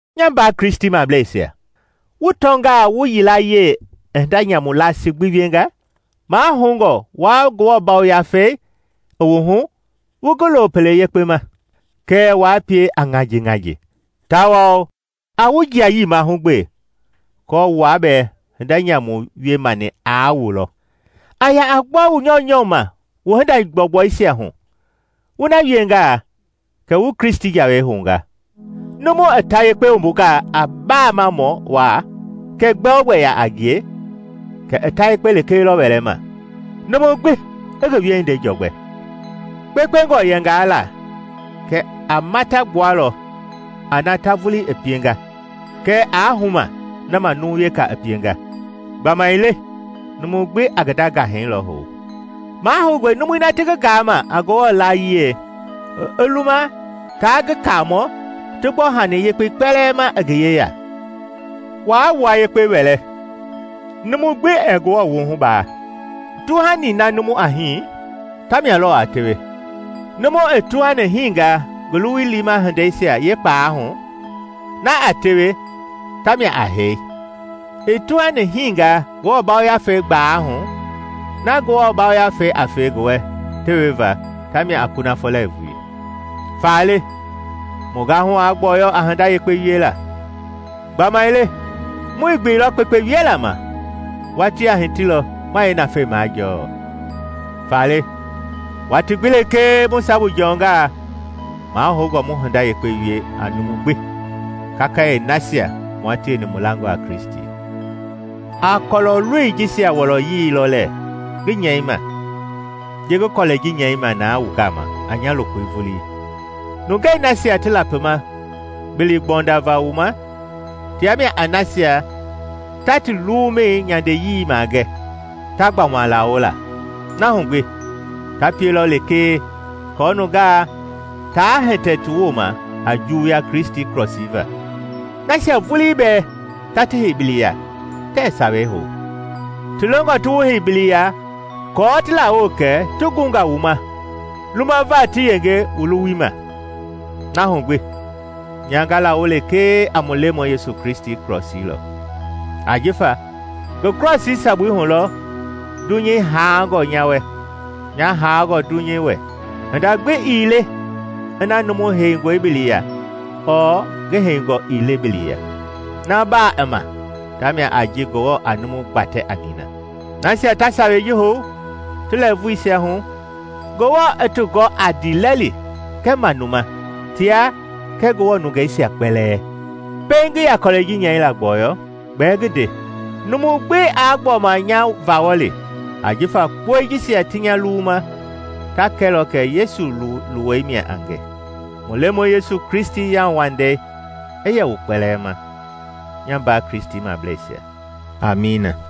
Nya mbaa Kristimableisia, wu tɔngaa wu yilayee i hinda nyamu laasi gbi wienga, mahoungɔ wua Ngewɔ Yafei i wu hu wu ngi lo pele yekpe ma, kɛɛ waa pie a ŋajiŋaji. Tawao a wu jiayii mahugbe aako wua bɛɛ hinda nyamu wie mani aa wu lɔ. A ya a gbɔ wu nyɔunyɔ ma wu hinda gbɔugbɔisia hu; wu na wiengaa kɛ wu Kristi jawei hounga. Numu i ta yekpe wumbungaa a baamamɔ waa kɛɛ gbɛ-o-gbɛ yaa a ngie, kɛ i ta yekpe lekee lɔ wɛlɛma. Numu gbi i ngi wiehindei jɔgbɛ. Kpekpengɔ yɛngaa la, kɛ a mata gbualɔ a na ta vulii i pienga, kɛɛ aa huma na ma numu weka i pienga. Gbamaile numu gbi a ngi nda ngahɛi lɔ hou. Mahoungɔe numui na ti ngi gaama a Ngewɔ layiei i luma taa ngi Kaamɔ ti gbɔ hani yekpei kpɛlɛɛ ma i ngi yeya. Waa wua yekpe wɛlɛ; numu gbi ɛɛ Ngewɔ wuhu baa. Tuhani na numu a hii, tamia lɔɔ a tewe. Numu i tuhani hinga ngi luwui liima hindeisia yeekpalɛi hu, na a tewe na tamia a hee; i tuhani hiingaa Ngewɔ Yafei gbaalɛi hu, na Ngewɔ Yafei a fe ngi wɛ teweva, tamia a kunafɔ lɛɛvui. Faale mu gahu aa gbɔyɔ a hinda yekpe wiela; gbamaile muii gbeilɔ kpekpe wiela ma, watii a hitilɔ ma yeenafei majɔɔ. Faale, watii gbi lekee mu sabu jɔnga, mahoungɔ mu hinda yekpe wie a numu gbi, kakayee nasia mua tieni mu langɔ a Kristi. A kɔlɔ-loi jisia wɔlɔyii lɔ lɛɛ ngi nyɛima ji ngi kɔlɛi ji nyɛima na wu gama a nya lokoi vulii! Nungɛi nasia ti lapima bili gbɔndava wu ma tia mia a nasia ta ti luwumɛi nyandeyii magɛ, ta gbɔma lawo la. Na hu gbi, ta pielɔ lekee aako nungaa taa hitɛ ti wooma a juwuya Kristi krɔsii va. Nasia vulii bɛɛ ta ti hei bili ya tɛɛ Sawei hou; ti longɔ ti wu hei bili ya kɔɔ ti lawo kɛ ti gunga wu ma lumava ti yenge wu luwui ma. Na hu gbi, nya nga lawo lekee a mu Lemɔi Yesu Kristi krɔsii lɔ; ajifa ngi krɔsii sabui hu lɔ dunyei haangɔ nya wɛ, nya haangɔ dunyei wɛ. Hinda gbi ii le ina numu heingɔe bili ya ɔɔ ngi heingɔ ii le bili ya. Na baa i ma ta mia a ji Ngewɔ a numu gbatɛ a nina. Nasia ta sawei ji hou ti lɛɛvuisia hu, Ngewɔ i ti gɔ a ndiilɛli kɛɛ manuma tia kɛɛ Ngewɔ nungeisia kpɛlɛɛ! Pɛiŋ ngi ya kɔlɛi ji nyɛila gbɔyɔ: gbɛɛ ngi nde; numu gbi aa gbɔma nya vawɔli, ajifa kpɔi jisia ti nya luwuma ta kɛlɔ kɛ Yesu luwei mia a nge. Mu Lemɔi Yesu Kristi yauwandei i yɛ wu kpɛlɛɛ ma, nya mbaa Kristimableisia. Amiina.